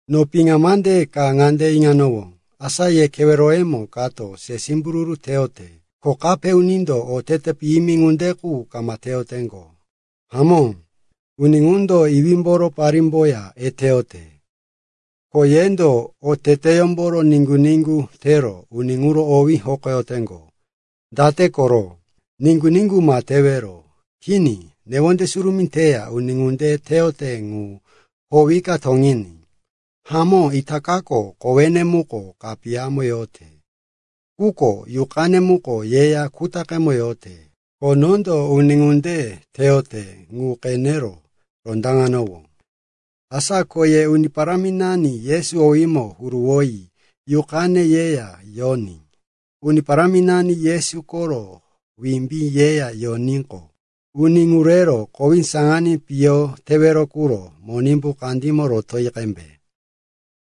No piŋa mande ka ŋande iŋanowó, asa ye keweroyemo kato se simbururu teyote, ko kape unindo otete piyimi ŋunde qu kama teyoteŋgo. Hamó, uni ŋundo iwímboro parímboya eteyote. Ko yendo oteteyómboro niŋgu-niŋgu tero uni ŋuro owí hokoyoteŋgo! Date koro? Niŋgu-niŋgu ma tewero. Kini, newonde surumí teya uni ŋunde teyote ŋu howika toŋiní! Hamó itakako kowene muko kapiyamo yote, quko yuqane muko yeya kutaqe yote. Ko nondo uni ŋunde teyote ŋu no qenero rondaŋanowó. Asa ko ye Uni Paráminani Yesu owímo huruwoyi yuqane yeya yoní Uni Paráminani Yesu koro wimbí yeya yoníqo, uni ŋu rero kowí saŋaní piyo tewero quro Monimbu kandímo rotoyi qembe.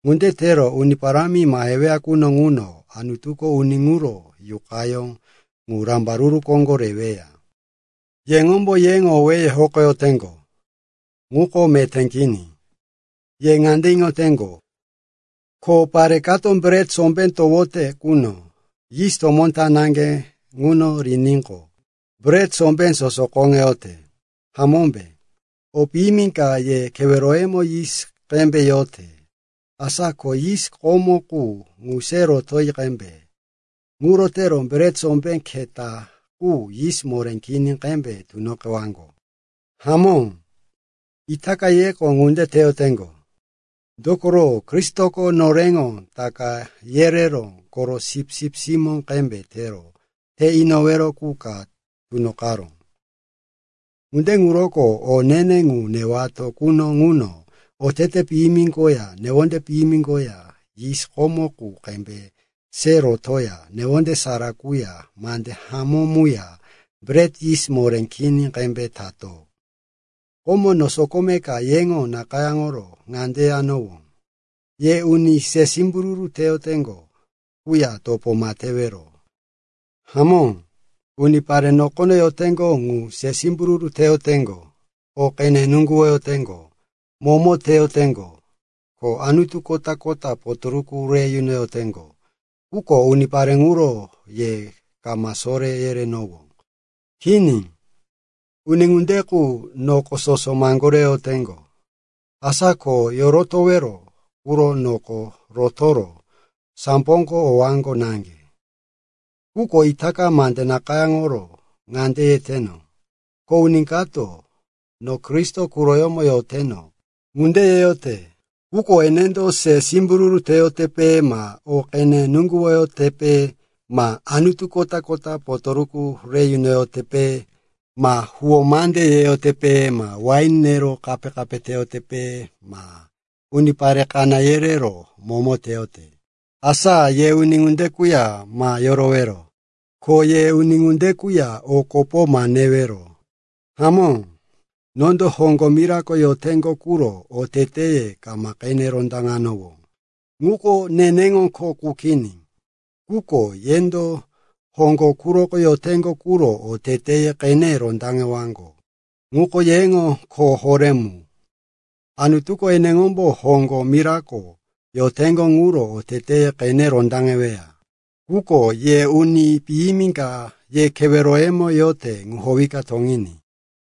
Ŋuro tero Uni Parámi maheweya quno ŋuno Anutuko uni ŋuro yuqayó ŋu rambaruru koŋgo reweya. Yeŋombo yeŋo owéye hokoyoteŋgo, ŋuko meté kini. Ye ŋande iŋoteŋgo, ko pare kato bret sombé towote quno yis tomó ta naŋge ŋuno riníqo, bret sombé soso koŋeyote, hamómbe? O piyimi ka ye keweroyemo yis qembe yote. Asa ko yis komo qu ŋu se roti qembe. Ŋuro tero bret sombé keta qu yis moré kini qembe tunoqewaŋgo. Hamó, itaka yeko ŋunde teyoteŋgo. Dokoro Kristoko noreŋo Taka yereró koro sipsip simó qembe tero te inowero qu ka tunoqaró. Ŋunde ŋuroko o ne-ne ŋu newato quno ŋuno otete piyimi koya newonde piyimi koya yis komo qu qembe se rotoya newonde sara quya mande hamó muya bret yis moré kini qembe tato. Komo no sokome ka yeŋo nakayáŋoro ŋande yanowó, “Ye uni se simbururu teyoteŋgo quya topo ma tewero.” Hamó, unipare nokono yoteŋgo ŋu se simbururu teyoteŋgo, o qene nuŋguwoyoteŋgo, momo teyoteŋgo ko anutu kota-kota potoruku re yunoyoteŋgo. Quko unipare ŋuro ye kama soré yerenowó. Kini, uni ŋunde qu noko sosoko maŋgoreyoteŋgo. Asa ko yorotowero quro noko rotoro samboko owaŋgo naŋge. Quko itaka mande nakayáŋoro ŋande yeteno, ko uni kato, no Kristo quroyómo yoteno, ŋunde yeyote, quko enendo se simbururu teyotepe ma o qene nuŋguwoyotepe ma anutu kota-kota potoruku re yunoyotepe ma huwó mande yeyotepe ma wain nero kape teyotepe ma unipare kaná yerero momo teyote, asa ye uni ŋunde quya ma yorowero. Ko ye uni ŋunde quya o kopo ma newero. Hamó, nondo hoŋgo mirako yoteŋgo quro oteteye kama qene rondaŋewano. Ŋuko neneŋo kho qu kini. Quko yendo hoŋgo quroko yoteŋgo quro oteteye qene rondaŋewaŋgo. Ŋuko yeŋo kho horé mu. Anutuko eneŋombo hoŋgo mirako yoteŋgo quro oteteye qene rondaŋeweya. Quko “ye uni piyimi ka ye keweroyemo yote ŋu howika toŋiní.”